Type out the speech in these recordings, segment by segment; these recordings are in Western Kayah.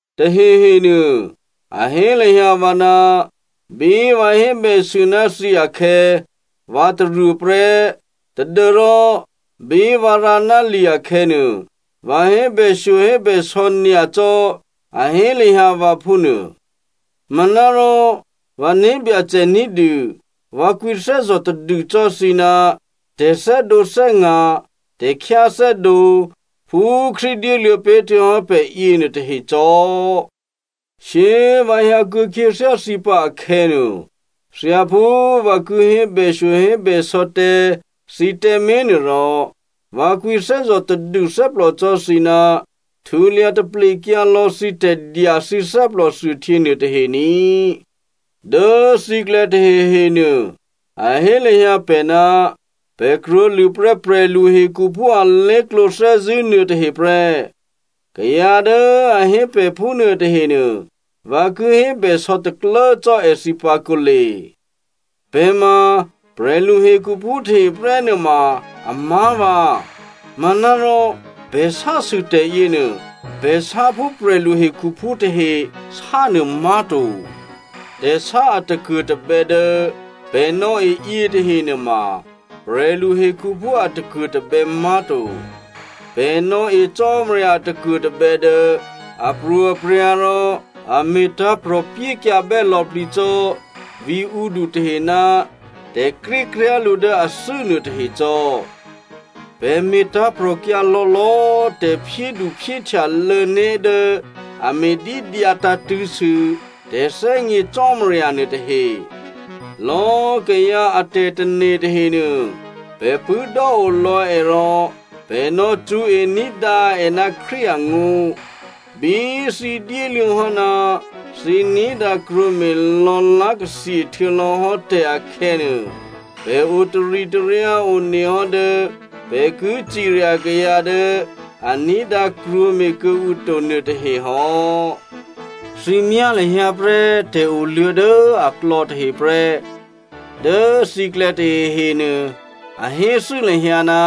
Tahehenuô a hé lahyǎ vǎ ná bí vǎ hébèsû ná thǐ akhè̌, vǎ taruô prè́ tadû́rò bí vǎ rǎ ná li akhè̌nuô, vǎ hébèshyohébèsò̌ nyacò́, a hé lahyǎ vǎ phúnuô. Manárò vǎ né̤byacè ní̤dû vǎ kwǐthè́zò̤ tadû cò́ thǐ ná tè̤thè́dǒthè́nga̤, tè̤khyáthè́dǒ phú Krístu dyéluô̌ pé̤ htuô̌hò́ pè̤ yěnuô tahe cò́. Shyé꤮ vǎ hyǎ kuô̌ khyěthyá thǐ pǎ akhè̌nuô, thyáphú vǎ ki hébèshyohébèsò̌ tǎ thǐ tǎmé̤ nuôrò, vǎ kwǐthè́zò̤ tadû thè́plò cò́ thǐ ná htulya taplekyǎ lò̌ thǐ tè̤dya thǐ thè́plòthuôhtyě nuôtahe ní꤮. Dố thǐklè̌ tahehenuô a hé lahyǎ pè̤ ná pè̤ krwǒlṳ̂ prè́ prè̤lu hekhuphú alé̤klǒ thè́zṳ̂́ nuôtahe prè́. Kayǎ dố a hé pè̤ phúnuô tahenuô, vǎ ki hébèsò̌ taklố cò́ èthǐ pǎ kǒle. Pè̤ ma prè̤lu hekhuphú tahe prè́ nuôma amá̤vǎ, manárò pè̤ sásû tè̤ yěnuô, pè̤ sá phú prè̤lu hekhuphú tahe sánuô má̤to. Tè̤sá a takuô̤tabè̌ dố pè̤ nò̌e yětahe nuôma prè̤lu hekhuphú a takuô̤tabè̌ má̤to. Pè̤ nò̌e Cò́marya a takuô̤tabè̌ dố apro̤aprya̤ rò a me̤tǎ̤prò̤ pyékyǎbè́ lò̌plǐ cò́ vǐ̤ǔdu tahe ná tè̤krékryá̤ lǔ dố athû́ nuôtahe cò́. Pè̤ me̤tǎ̤prò̤kyǎ lò̌lò̌꤮ tè̤phyéduphyéhtyalô̌ né̤ dố a me̤dídyǎ tǎ̤tṳ̂̌sû tè̤thè́gně Cò́marya nuôtahe. Lò̌꤮ kayǎ a tè̤tane̤ tahenuô pè̤ pṳ̂́dò́o lò̌ è rò pè̤ nò̌ cṳ̌e ní̤dǎ è ná Krístu angó̤. Bí thǐ dyéluô̌ hò́ ná thǐ ní̤dǎ krwǒme̤ lò̌lá̤takli htuô̌lò̌hò́ tè̤ akhè̌nuô, pè̤ o taritaryǎ one hò́ dố pè̤ ki cirya kayǎ dố a ní̤dǎ krwǒme̤ kuô̌ǔ to nuôtahe hò́. Thǐ myá lahyǎ prè́ tè̤oluô̌ dố aklò̌ tahe prè́. Dố thǐklè̌ tahehenuô a héthû́ lahyǎ ná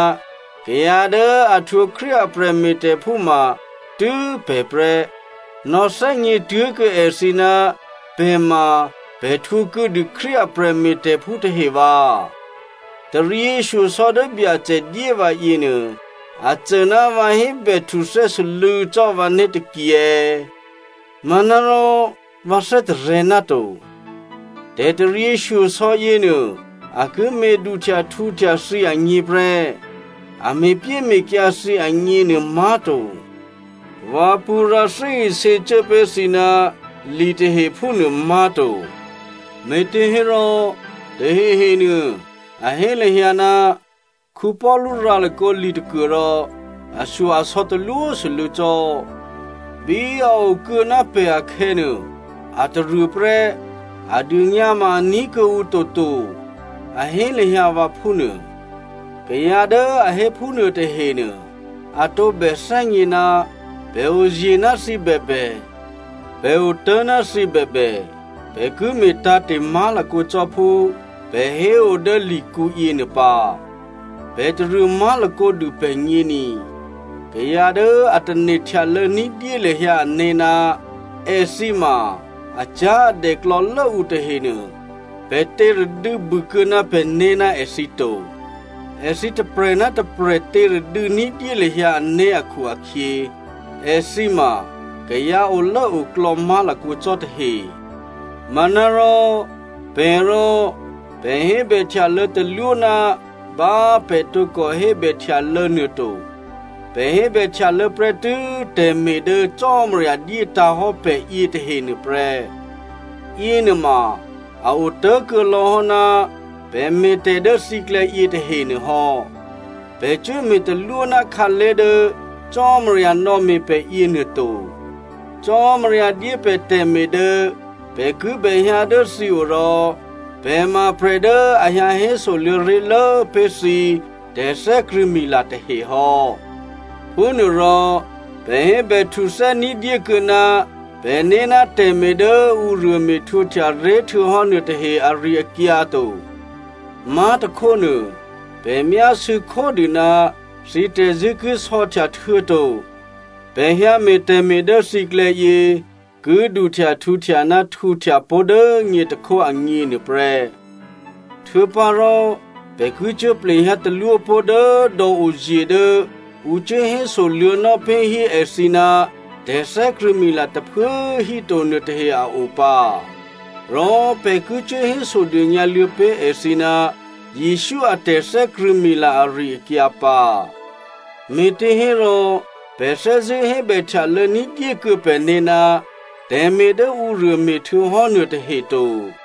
kayǎ dố a htwǒ Krístu a prè̤me̤tè̤phú ma tû́ pè̤ prè́. Nò̌thè́gně tuố̤kuô̌ èthǐ ná pè̤ ma pè̤ htwǒ kuô̌dû Krístu a prè̤me̤tè̤phú tahe vǎ. Taryěshyosò̌ dố Byacè dyé vǎ yěnuô, a cô ná vǎ hébè htuthè́ sû́lû̌ cò́ vǎné̤ taki è̌? Manárò vǎ thè́tarè̤̌ náto. Tè̤taryěshyosò̌ yěnuô, a ki me̤ duhtyahtǔhtya thǐ agně prè́, a me̤pyéme̤kyǎ thǐ agněnuô má̤to. Vǎ pṳ̌ rǎ thè́isě cuố pé̤ thǐ ná li tahe phúnuô má̤to. Me̤těhérò tahehenuô, a hé lahyǎ, “Paulu rǎ lakǒ li tôkuôrò ashyo-asò̌ talwósû́lû̌ cò́. Bí a okuô̌ ná pè̤ akhè̌nuô, a taruô prè́, a dônyǎ ma a ní̤ kuô̌ǔ toto,” a hé lahyǎ vǎ phúnuô. Kayǎ dố a hé phúnuô tahenuô, a tǒbè thè́gně ná pè̤ oye̤ ná thǐ bèbè, pè̤ otố̤ ná thǐ bèbè, pè̤ ki me̤ tǎ̤te̤ má̤lakǒ cò́ phú pè̤ héo dố likǔ yěnuô pǎ. Pè̤ taruô má̤lakǒ dû pè̤gně ni. Kayǎ dố a tane̤ htyalô̌ ní̤dyé lahyǎ ané̤ ná èthǐ ma acyá̤adè klò̌lố ǔ tahenuô pè̤ těradû̌ bû kuô̌ ná pè̤né̤ ná èthǐ to. Èthǐ tôprè̤ ná tôprè̤ těradû̌ ní̤dyé lahyǎ ané̤ akhu-akhyě, èthǐ ma kayǎ olốoklò̌ má̤lakǒ cò́ tahe. Manárò, pè̤ rò, pè̤ hébèhtyalô̌ talwó ná bá pè̤ tǒkò hébè htyalô̌ nuô to. Pè̤ hébè htyalô̌ prè́tû́ tè̤me̤ dố Cò́marya dyétǎ̤ hò́ pè̤ yětahe nuôprè́. Yěnuôma a otố̤kuô̌lò̌ hò́ ná pè̤ me̤tè̤ dố thǐklè̌ yětahenuô hò́. Pè̤ cuố me̤ talwó ná khǎlé̤ dố Cò́marya nò̌me̤ pè̤ yěnuô to. Cò́marya dyé pè̤ tè̤me̤ dố pè̤ kibè hyǎ dố thǐ o rò pè̤ ma prè̤ dố a hyǎ hésoluô̌ ré̤lố pé̤ thǐ tè̤thè́krṳ̂̌mila tahe hò́. Phúnuôrò pè̤ hébèhtuthè́ ní̤dyé kuô̌ ná pè̤né̤ ná tè̤me̤ dố ǔruô me̤htwǒhtya ré̤htuô̌hò́ nuôtahe ari-akyǎ to. Má̤tôkhónuô pè̤ myásû̌ khódû ná thǐ tè̤zṳ̂́ ki sò̌htya htuô̌to pè̤ hyǎme̤ tè̤me̤ dố thǐklè̌ yě ki duhtyahtǔhtya ná htǔhtya pó̤ dố nyě tôkhó agně nuôprè́. Htuô̌pǎrò pè̤ ki cuố plehyǎ talwó pó̤ dố dò̌ oye̤ dố ǔ cuố hésoluô̌nò́ pé̤ hí èthǐ ná tè̤thè́krṳ̂̌mila tôphuố꤮ híto nuôtahe a o pǎ. Rò pè̤ ki cuố hésodônyǎ luô̌ pé̤ èthǐ ná Jesǔ a tè̤thè́krṳ̂̌mila ari-akyǎ pǎ. Me̤těhérò pè̤ thè́zṳ̂́ hébèhtyalô̌ ní̤dyékuô̌ pè̤né̤ ná tè̤me̤ dố ǔruô me̤htuô̌ hò́ nuôtahe to.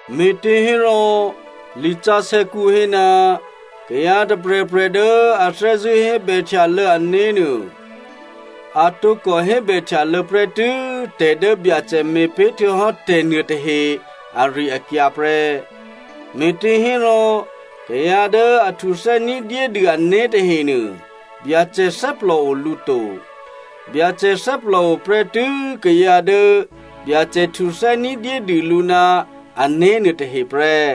Me̤těhérò, lisǎsè̌kǔ hé, “Kayǎ tôprè̤prè̤ dố a thè́zṳ̂́ hébèhtyalô̌ ané̤ nuô, a tǒkò hébèhtyalô̌ prè́tû́ tè̤ dố Byacè me̤pé̤ htuô̌hò́ tè̤ nuôtahe ari-akyǎ prè́.” Me̤těhérò, kayǎ dố a htuthè́ ní̤dyédû ané̤ tahenuô, Byacè thè́plòo lǔ to, Byacè thè́plòo prè́tû́ kayǎ dố Byacè htuthè́ ní̤dyédû lǔ ná ané̤ nuôtahe prè́.